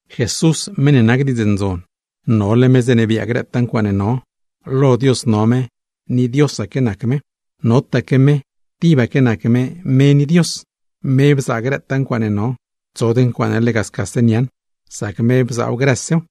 Jesús, meṉ ne nac Diidz Ndzon, nole me zeeṉe biaa grëtaa ncuaaṉe no; lo Dios no me ni Diosaque nac me. Notaque me, tibaque nac me: me ni Dios. Me bzaa grëtaa ncuaaṉe no, tsod ncuaaṉe lega scase niaaṉ; sac me bzaaw grësew.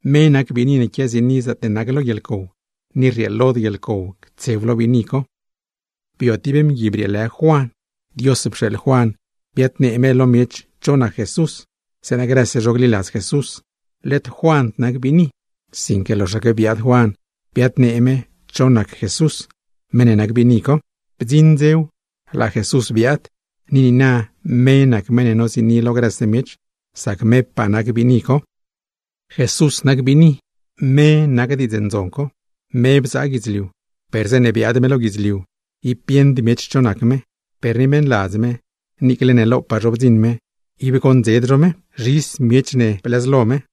Me nac biini ne quiaziini zaatne nac lo guieḻcow, ni rrieelod guieḻcow ctsew lo biini co. Bio tib mgui brieelë Juan, Dios pxeeḻ Juan biadnee Juan lo miech cho nac Jesús, zeeṉa grëse zho gliladz Jesús. Led Juand nac biini, sinque loxaque biaad Juan biaadlu Juan Jesús, meṉ ne nac biini co. Bdziṉ dzew laa Jesús biaad, ni niina me nac meṉ ne noziini lo grëse miech, sac mepaa nac biini co. Jesús nac biini, me nac Diidz Ndzon co. Me bzaa guidzliu, per zeeṉe biaad me lo guidzliu ib bieṉd miech cho nac me. Per ni meṉladz me, niicle ne lopaa zho bdziṉ me ib goṉdzed zho me; tib chop zha ne blëzlo me.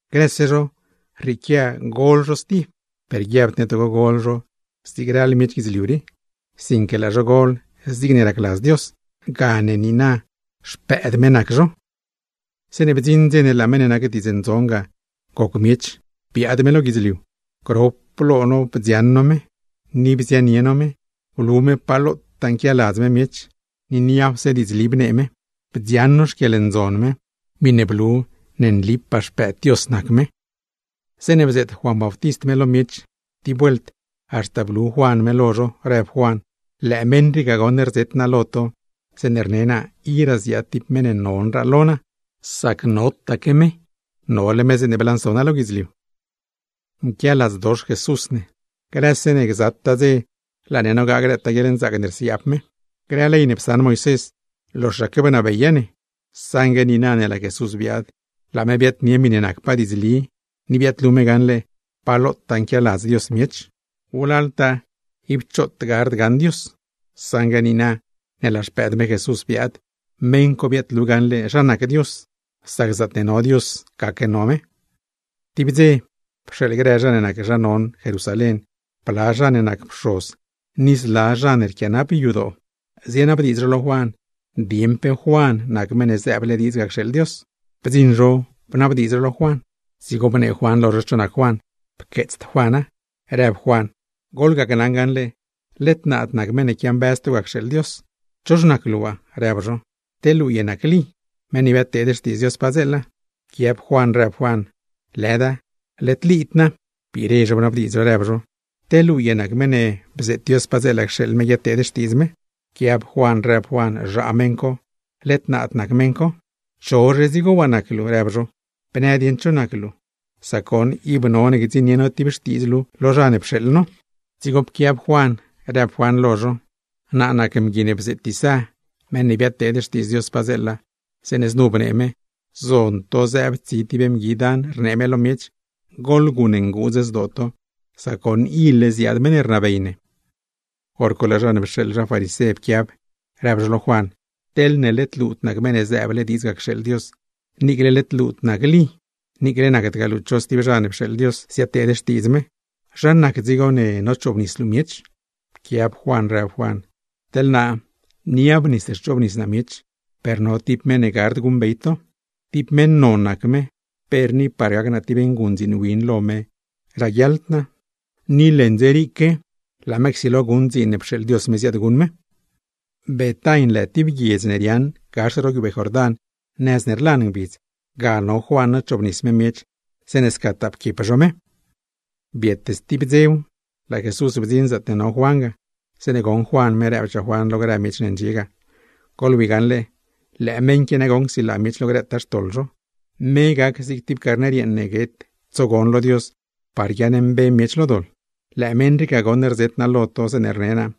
¡Grëse zho, rrieequia gol zho stib! Per guiabd ne togo gol zho zigne ral grë miech guidzliu rii, sinque laa zho gol zigne racladz Dios; gane niina xpëëd me nac zho. Zeeṉe bdziṉ dze ne laa meṉ ne nac Diidz Ndzon ga goc miech biaad me lo guidzliu, grop lo no bdzioṉ no me, ni bzianie no me. Blu me pa lotaa nquialadz me miech, ni niapse diidzli bnee me. Bdzioṉ no xquieḻndzon me ne nac me tibpaa mëëd lo Dios, meṉ ne nac Pxoz ne. Zeeṉe bzeet Juan Bautist me lo miech, tib vuelt haxta blu Juan me lo zho, rëb Juan: “Lëë meṉ rii ga goṉ rzet naa lo to zeeṉe rne naa: Iraa ziaad tib meṉ ne mazdraa non lo naa, sac notaque me; nole me zeeṉe blanso naa lo guidzliu.” Nquialadzdox Jesús ne, grëse ne gzataa dze laa ne nogaa grëtaa guieḻnzaac ne rsiaab me. Zeeṉe psaṉ Moisés ley, loxaque bnabeya ne; saṉgue niina ne laa Jesús biaad, laa me biaadnie miṉe nacpaa diidzli ni biaadlu me gaṉle pa lotaa nquialadz Dios miech. Wlaltaa ib choot gard gaṉ Dios; saṉgue niina ne laa Xpëëd me Jesús biaad, meṉ co biaadlu gaṉle zha nac Dios; sac zaatne no Dios gaque no me. Tib dze pxeeḻ grë zha ne nac zha non Jerusalén, bla zha ne nac pxoz ni zla zha ne rquianap yadoo, zienabdiidz zho lo Juan dieṉ cho nac Juan. Bdziṉ zho bnabdiidz zho lo Juan. Dzigo bneeli Juan lo zho, rëb Juan: ―Goḻgacnaṉ gaṉle, led naad nac Meṉ ne quiambëz to ga cxeeḻ Dios. ―¿Chox nac luu waa? ―rëb zho―. ¿Te luu ye nac Lí, meṉ ne biadteed xtiidz Dios padzeela? Pquiab Juan rëb Juan: ―Lëda, led Líd naa. Biire zho bnabdiidz zho, rëb zho: ―¿Te luu ye nac meṉ ne bzeet Dios padzeela cxeeḻ me guiadteed xtiidz me? Pquiab Juan rëb Juan: ―Zhaa meṉ co, led naad nac meṉ co. ―¿Cho dzigo nac luu? ―rëb zho―. Bnë dieṉ cho nac luu; sac goṉ ib none gdziṉnie no tib xtiidz luu lo zha ne pxeeḻ no. Dzigo pquiab Juan, rëb Juan lo zho: ―Naa nac mgui ne bzeet Isá, meṉ ne biadteed xtiidz Dios padzeela, zeeṉe znu bnee me: “Zon to zëëb tsi tib mgui dan rnee me lo miech: ¡Goḻguṉ nguudz zdoo to, sac goṉ ile ziaad meṉ ne rnabey ne!” Horco laa zha ne pxeeḻ zha farisé pquiab, rëb zho lo Juan: ―Teḻne led luud nac Meṉ ne zëëble diidz ga cxeeḻ Dios, niicle led luud nac Lí, niicle nacdgaa luu cho stib zha ne pxeeḻ Dios ziadteed xtiidz me, ¿zha nac dzigo ne nochoobnis luu miech? Pquiab Juan rëb Juan: ―Teḻ naa niab nis rchoobnis naa miech, per no tib meṉ ne gard guṉbey to. Tib meṉ non nac me, per ni par gac naa tib nguṉdziin win ne glit lab me ni me raguiaḻd naa; ni merle csilo guṉ me dziin ne pxeeḻ Dios me guṉ me. Betain lë tib guiedz ne riaaṉ gax ro guiubee Jordán, nëz ne rlan ngbidz; ga no Juan nochoobnis me miech zeeṉe scataa pquiep zho me. Biet stib dzew, laa Jesús bdziṉ zaatne no Juan ga. Zeeṉe goṉ Juan me, rëbchaa Juan lo grë miech ne ndxie ga: ―¡Goḻwi gaṉle, lëë meṉ qui goṉ csilaa miech lo grëtaa xtoḻ zho! ¡Me gac zig tib carner yeeṉ ne guet tsogon lo Dios par guiaaṉmbe miech lo doḻ! Lëë meṉ rii ga nagoṉ rzet naa lo to zeeṉe rne naa: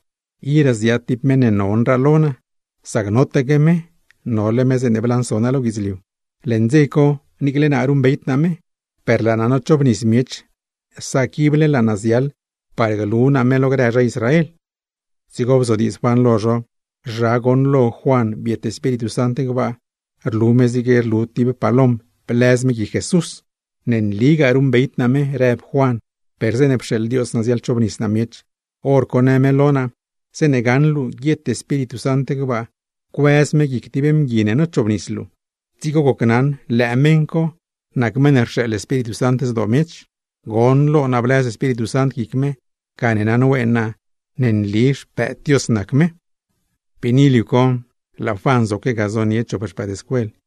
“Iraa ziaad tib meṉ ne mazdraa non lo naa, sac notaque me; nole me zeeṉe blanso naa lo guidzliu.” Leṉ dze co niicle naa ruṉbeyd naa me; per laa naa nochoobnis miech sac ible laa naa ziaḻ par glu naa me lo grë zha Israel. Dzigo bzodiidz Juan lo zho, zha goṉlo Juan biet Espíritu Sant gbaa, rlu me zigne rlu tib palom blëz me guic Jesús. ―Ne nligaa ruṉbeyd naa me ―rëb Juan―. Per zeeṉe pxeeḻ Dios naa ziaḻchobnis naa miech, hor co në me lo naa: “Zeeṉe gaṉ luu guiet Espíritu Sant gbaa cuëz me guic tib mgui ne nochoobnis luu, dzigo gocnaṉ lëë meṉ co nac meṉ ne rxeeḻ Espíritu Sant zdoo miech.” Goṉlo naa blëz Espíritu Sant guic me; gane naṉween naa ne nli Xpëëd Dios nac me. Biini liu co, laa Juan zoque ga zonie me chop xpëëdscuel me.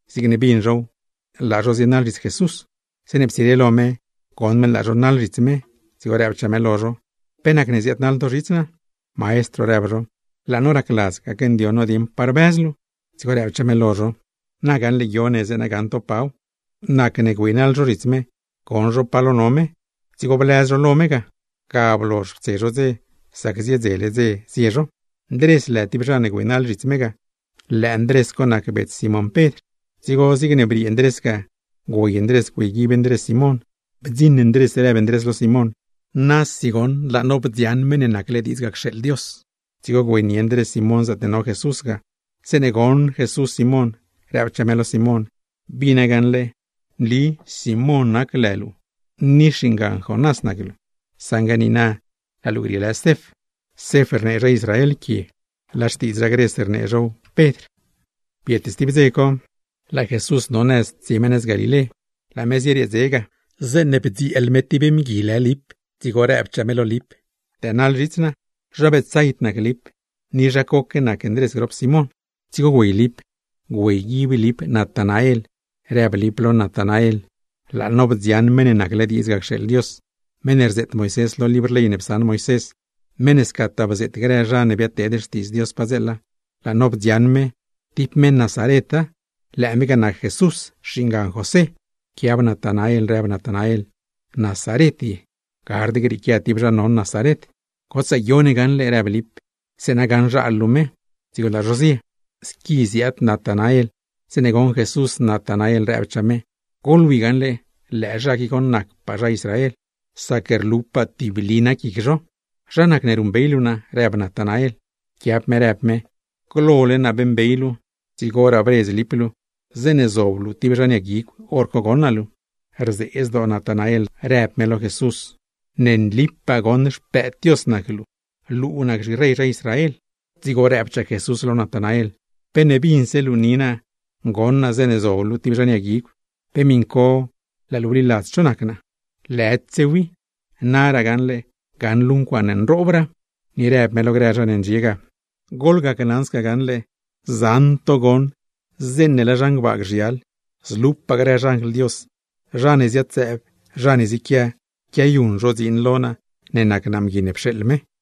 Zigne bin zhow, laa zho zienaḻ zhits Jesús. Zeeṉe ptsire lo me, goṉ me laa zho naḻle zhits me; dzigo rëbchaa me lo zho: ―¿Pe nac ziaadnaḻ to zhits naa? ―Maestro ―rëb zho―, laa no racladz gacndioṉ no dieṉ pa rbëz luu. Dzigo rëbchaa me lo zho: ―Na gaṉle guio ne, zeeṉa gaṉ to paw. Nacne güeynaḻ zho zhits me, goṉ zho pa lo no me; dzigo blëz zho lo me ga. Ga blozh ptse zho dze, sac ziedzele dze zie zho. Ndrés lë tib zha ne güeynaḻ zhits me ga; lëë Ndrés co nac bets Simón Pedr. Dzigo zigne briee Ndrés ga güey Ndrés güeyguib Ndrés Simón. Bdziṉ Ndrés rëb Ndrés lo Simón: ―¡Nasi goṉ laa no bdzioṉ Meṉ ne nacle diidz ga cxeeḻ Dios! Dzigo güeynie Ndrés Simón zaatne no Jesús ga. Zeeṉe goṉ Jesús Simón, rëbchaa me lo Simón: ―Bina gaṉle, nli Simón nac lë luu ni xingan Jonás nac luu, saṉgue niina laa luu grieelë Cef. (Cef rnee zha Israel quie, laa xtiidz zha Gres rnee zhow Pedr.) Biet stib dze co, laa Jesús no nëz tsie me nëz Galilé. Laa me zieriee dze ga, zeeṉe bdzieel me tib mgui lë Lip; dzigo rëbchaa me lo Lip: ―Dënaḻ zhits naa. Zha Betsaid nac Lip, ni zha coque nac Ndrés grop Simón. Dzigo güey Lip güeyguib Lip Natanael; rëb Lip lo Natanael: ―¡Laa no bdzioṉ Meṉ ne nacle diidz ga cxeeḻ Dios! Meṉ ne rzeet Moisés lo libr ley ne psaṉ me, meṉ ne scataa bzeet grë zha ne biadteed xtiidz Dios padzeela. ¡Laa no bdzioṉ me, tib meṉ Nazareta, lëë me ga nac Jesús, xingan José! Pquiab Natanael, rëb Natanael: ―¿Nazaret ye? ¡Gard grieequia tib zha non Nazaret! ―Gotsaa guio ne gaṉle ―rëb Lip―, zeeṉa gaṉzhal luu me. Dzigo laa zho zie. Squi ziaad Natanael, zeeṉe goṉ Jesús Natanael rëbchaa me: ―¡Goḻwi gaṉle, lëë zha qui goṉ nac merpaa zha Israel, sac mesi ib rquidied me! ―¿Zha nacne ruṉbey luu naa? ―rëb Natanael. Pquiab me rëb me: ―Glole naa beeṉbey luu, dzigoraa bredz Lip luu. Zeeṉe zob luu tib zhan yag guigw, hor co goṉ naa luu. Rzee zdoo Natanael, rëb me lo Jesús: ―¡Nlique nagoṉ luu nac Xpëëd Dios! ¡Luu nac zhirey zha Israel! Dzigo rëbchaa Jesús lo Natanael: ―¿Pe ne binse luu ni naa goṉ naa zeeṉe zob luu tib zhan yag guigw, pe miṉcose laa luu bliladz cho nac naa? ¡Naraa gaṉle gaṉ luu ncuaaṉe mazdraa nroob! Ni rëb me lo grë zha ne ndxie ga: ―Gneli naa lo to: zaṉaque to gaṉle zeeṉe laa zhan gbaa gzhial, zlupaa grë xanjl Dios, zha ne ziad-zëëb zha ne ziequia, quiayuṉ zho dziin lo naa, nac naa Mgui ne pxeeḻ me.